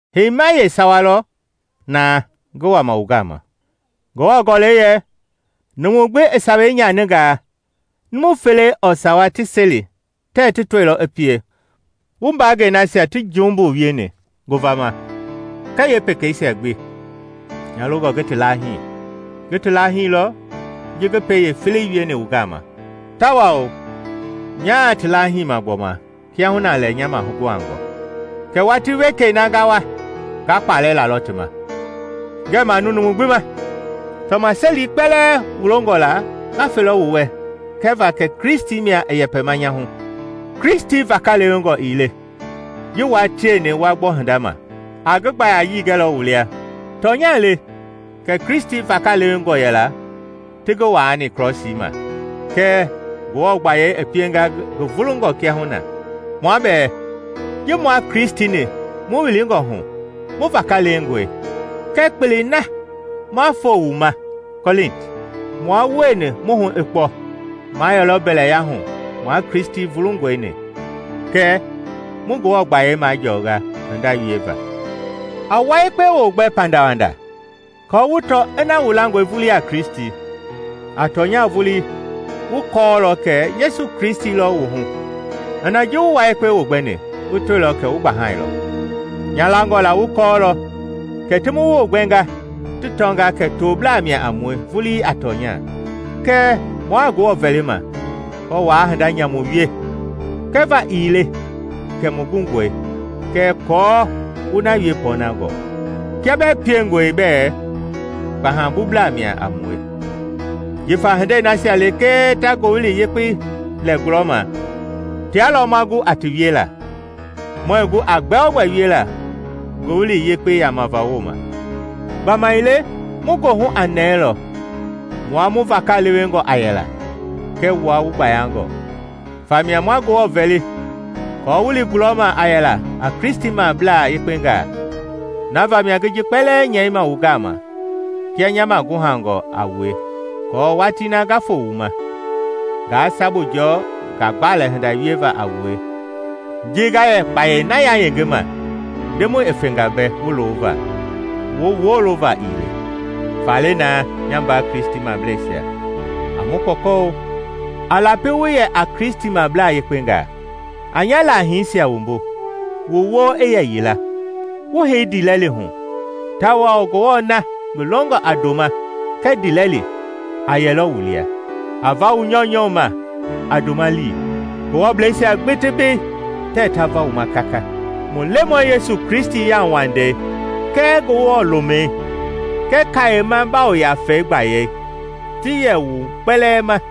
Heima yeesawa lɔ naa ngi wama wu gama. Ngewɔ Gɔlɛi yɛ, “Numu gbi i sawei nyaningaa, numu fele ɔɔ sawa ti seli tɛɛ ti tɔilɔ i pie.” Wu mbaangɛi nasia ti jumbu wieni ngovama kɛɛ yeepekeisia gbi, nya longɔ ngi ti laahii; ngi ti laahilɔ ji ngi pɛi yeefelei wieni wu gama, tawao nyaa ti laahiima gbɔma kiahuna lɛ nya maguhangɔ: kɛɛ watii wekei na nga wa nga kpalɛ lalɔ ti ma, ngɛɛ manu numu gbi ma. Tɔmaseli kpɛlɛɛ wu longɔ la nga felɔ wu wɛ kɛva kɛ Kristi mia i yɛpɛma nya hu. Kristi vakalewengɔ ii le ji wua tieni wa gbɔ hinda ma, a ngi gbayayii gɛlɔ wu lia. Tɔnya le kɛ Kristi vakalewengɔ yɛla ti ngi waani Krɔsii ma, kɛɛ Ngewɔ gbayei i pienga ngi vulungɔ kiahuna. Mua bɛɛ, ji mua Kristi-ni mu wilingɔ hu, mu vakalewengɔe. Kɛɛ kpelei na ma foo wu ma Kɔlinti, mua wueni mu hu i kpɔ, ma yɛlɔ mbɛya hu mua Kristi vulungɔi-ni, kɛ mu Ngewɔ gbayei majɔɔnga hinda wieva. A wua yekpe wogbɛ pandawanda aako wu tɔ ina wu langɔe vulii a Kristi. A tɔnya vulii wu kɔɔlɔ kɛ Yesu Kristi lɔ wu hu, ina ji wu wua yekpe wogbɛni wu tɔilɔ kɛ wu gbahailɔ. Nya langɔ la wu kɔɔlɔ kɛ ti mu wogbɛnga ti tɔnga kɛ toblaa mia a mue vulii a tɔnya. Kɛɛ mua Ngewɔ vɛlima kɔɔ waa hinda nyamu wie; kɛva ii le kɛ mu gungɔi, kɛɛ aako wu na wie pɔɔnangɔ, kia bɛɛ piengɔe bɛ kpahabublaa mia a mue. Jifa hindei nasia lekee ta Ngowili Yekpei lɛ gulɔma tia lɔ ma gu a ti wiela; muɛɛ gu a gbɛogbɛ wiela Ngowili Yekpei yamava wooma. Gbamaile mu goohu a nɛɛlɔ mua mu vakalewengɔ a yɛla kɛɛ wua wu gbayangɔ. Famia ma Ngewɔ vɛli aako wu li gulɔma a yɛla a Kristimablaa yekpengaa. Na vamia ngi ji kpɛlɛɛ nyɛima wu gama kia nya maguhangɔ a wue, aako watii na nga foo wu ma, ngaa sabu jɔɔ ngagbalɛ hinda wieva a wue ji nga yɛ kpayei na yayengema Ndemɔi i fenga mbɛ wu loova, wu wolova ii le. Faale naa, nya mbaa Kristimableisia, a mu kpɔkɔ-o. A lapi wu yɛ a Kristimablaa yekpengaa; a nya laahiisia wumbu; wu wo i yɛ yila, wu hei ndiilɛli hu, tawao Ngewɔ na ngi longɔ a ndoma kɛɛ ndiilɛli a yɛlɔ wu lia. A va wu nyɔunyɔ ma a ndoma lii. Ngewɔbleisia gbi mbei tɛɛ ta va wu ma kaka. Mu Lemɔi Yesu Kristi yauwandei kɛɛ Ngewɔ lomɛi kɛɛ Kayema Yafa mbaayɛi ti yɛ wu kpɛlɛɛ ma.